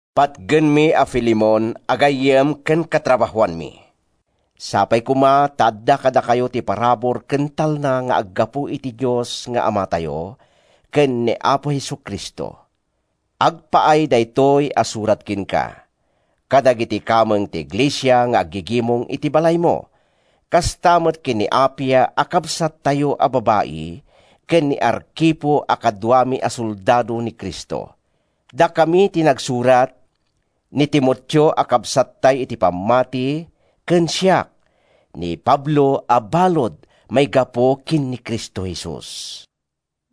Patgenmi a Filemon a gayyem ken katrabahoanmi, Sapay koma ta adda kadakayo ti parabur ken talna nga aggapu iti Dios nga Amatayo ken ni Apo Jesu-Cristo. Agpaay daytoy a surat kenka, kadagiti kameng ti iglesia nga aggigimong iti balaymo, kasta met ken ni Apia a kabsattayo a babai, ken ni Arkipo a kaduami a soldado ni Cristo. Dakami ti nagsurat—ni Timoteo a kabsattay iti pammati ken siak, ni Pablo a balud a maigapu ken ni Cristo Jesus.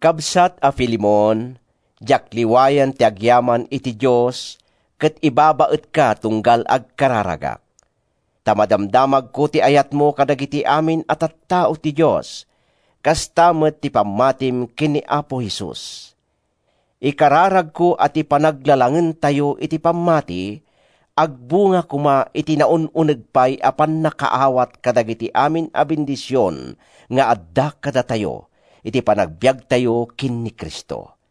Kabsat a Filemon, diak liwayan ti agyaman iti Diosko ket ibabaetka tunggal agkararagak. Ta madamdamagko ti ayatmo kadagiti amin a tattao ti Dios, kasta met ti pammatim ken ni Apo Jesus. Ikarkararagko a ti panaglalangentayo iti pammati, agbunga koma iti naun-uneg pay a pannakaawat kadagiti amin a bendision nga adda kadatayo iti panagbiagtayo ken ni Cristo.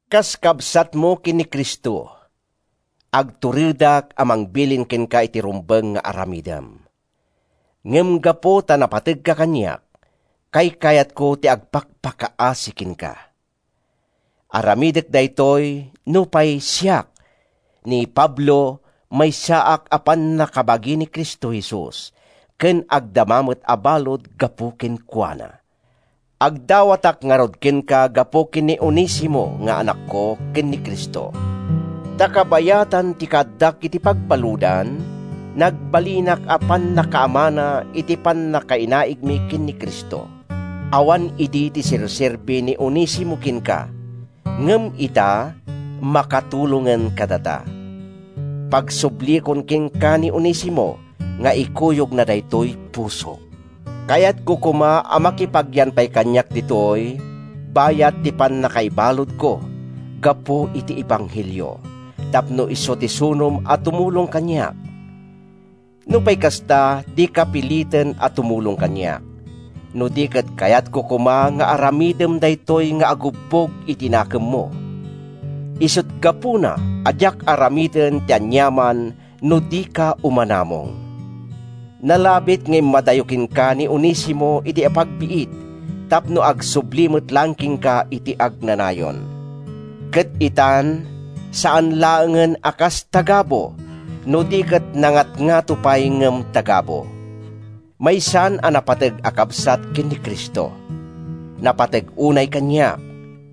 Kas kabsatmo ken ni Cristo, agturedak a mangbilin kenka iti rumbeng nga aramidem. Ngem gapu ta napategka kaniak, kaykayatko ti agpakpakaasi kenka. Aramidek daytoy, nupay siak, ni Pablo, maysaak a pannakabagi ni Cristo Jesus, ken agdama met a balud gapu kenkuana. Agdawatak ngarud kenka gapu ken ni Onesimo nga anakko ken ni Cristo. Ta kabayatan ti kaaddak iti pagbaludan, nagbalinak a pannakaamana iti pannakainaigmi ken ni Cristo. Awan idi ti serserbi ni Onesimo kenka ngem ita, makatulongen kadata. Pagsubliekon kenka ni Onesimo nga ikuyogna daytoy pusok. Kayatko koma a makipagyan pay kaniak ditoy bayat ti pannakaibaludko gapu iti ebanghelio, tapno isu ti sunom a tumulong kaniak. Nupay kasta, dika piliten a tumulong kaniak, no di ket kayatko koma nga aramidem daytoy nga agubbog iti nakemmo. Isut’ gapuna a diak aramiden ti aniaman no dika umanamong. Nalabit nga immadayo kenka ni Onesimo iti apagbiit tapno agsubli met laeng kenka iti agnanayon. Ket itan, saan laengen a kas tagabu, no di ket nangatngato pay ngem tagabu: Maysan a napateg a kabsat ken ni Cristo. Napateg unay kaniak,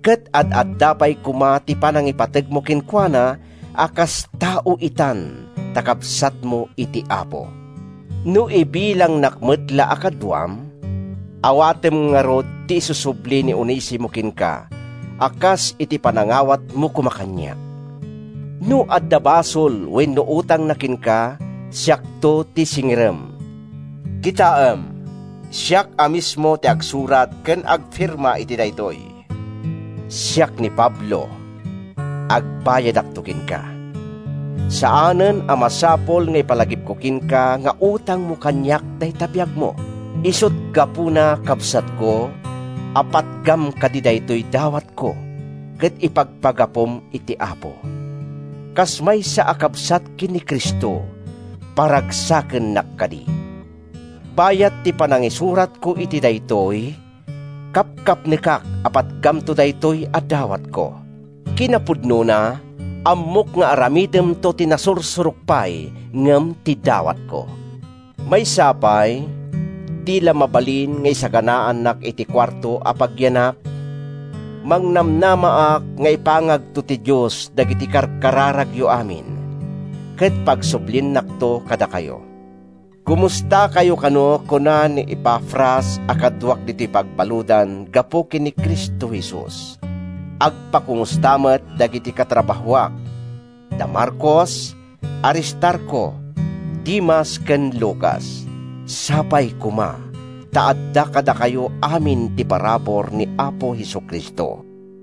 ket ad-adda pay koma ti panangipategmo kenkuana a kas tao itan ta kabsatmo iti Apo. No ibilangnak met la a kaduam, awatem ngarud ti isusubli ni Onesimo kenka a kas iti panangawatmo koma kaniak. No adda basol wenno utangna kenka, siakto ti singirem. Kitaem, siak a mismo ti agsurat ken agfirma iti daytoy: Siak ni Pablo. Agbayadakto kenka. (Saanen a masapul nga ipalagipko kenka nga utangmo kaniak dayta biagmo.) Isut’ gapuna, kabsatko, a patgam kadi daytoy dawatko, ket ipagpagapum iti Apo. Kas maysa a kabsat ken ni Cristo, paragsakennak kadi. Bayat ti panangisuratko iti daytoy, kapkapnekak a patgamto daytoy a dawatko. Kinapudnona, ammok nga aramidemto ti nasursurok pay ngem ti dawatko. Maysa pay, di la mabalin nga isaganaannak iti kuarto a pagyanak? Mangnamnamaak nga ipangagto ti Dios dagiti karkararagyo amin, ket pagsubliennakto kadakayo. Komustakayo kano kuna ni Epafras a kaduak ditoy pagbaludan gapu ken ni Cristo Jesus. Agpakomusta met dagiti katrabahoak, da Marcos, Aristarco, Demas, ken Lucas. Sapay koma ta adda kadakayo amin ti parabur ni Apo Jesu-Cristo.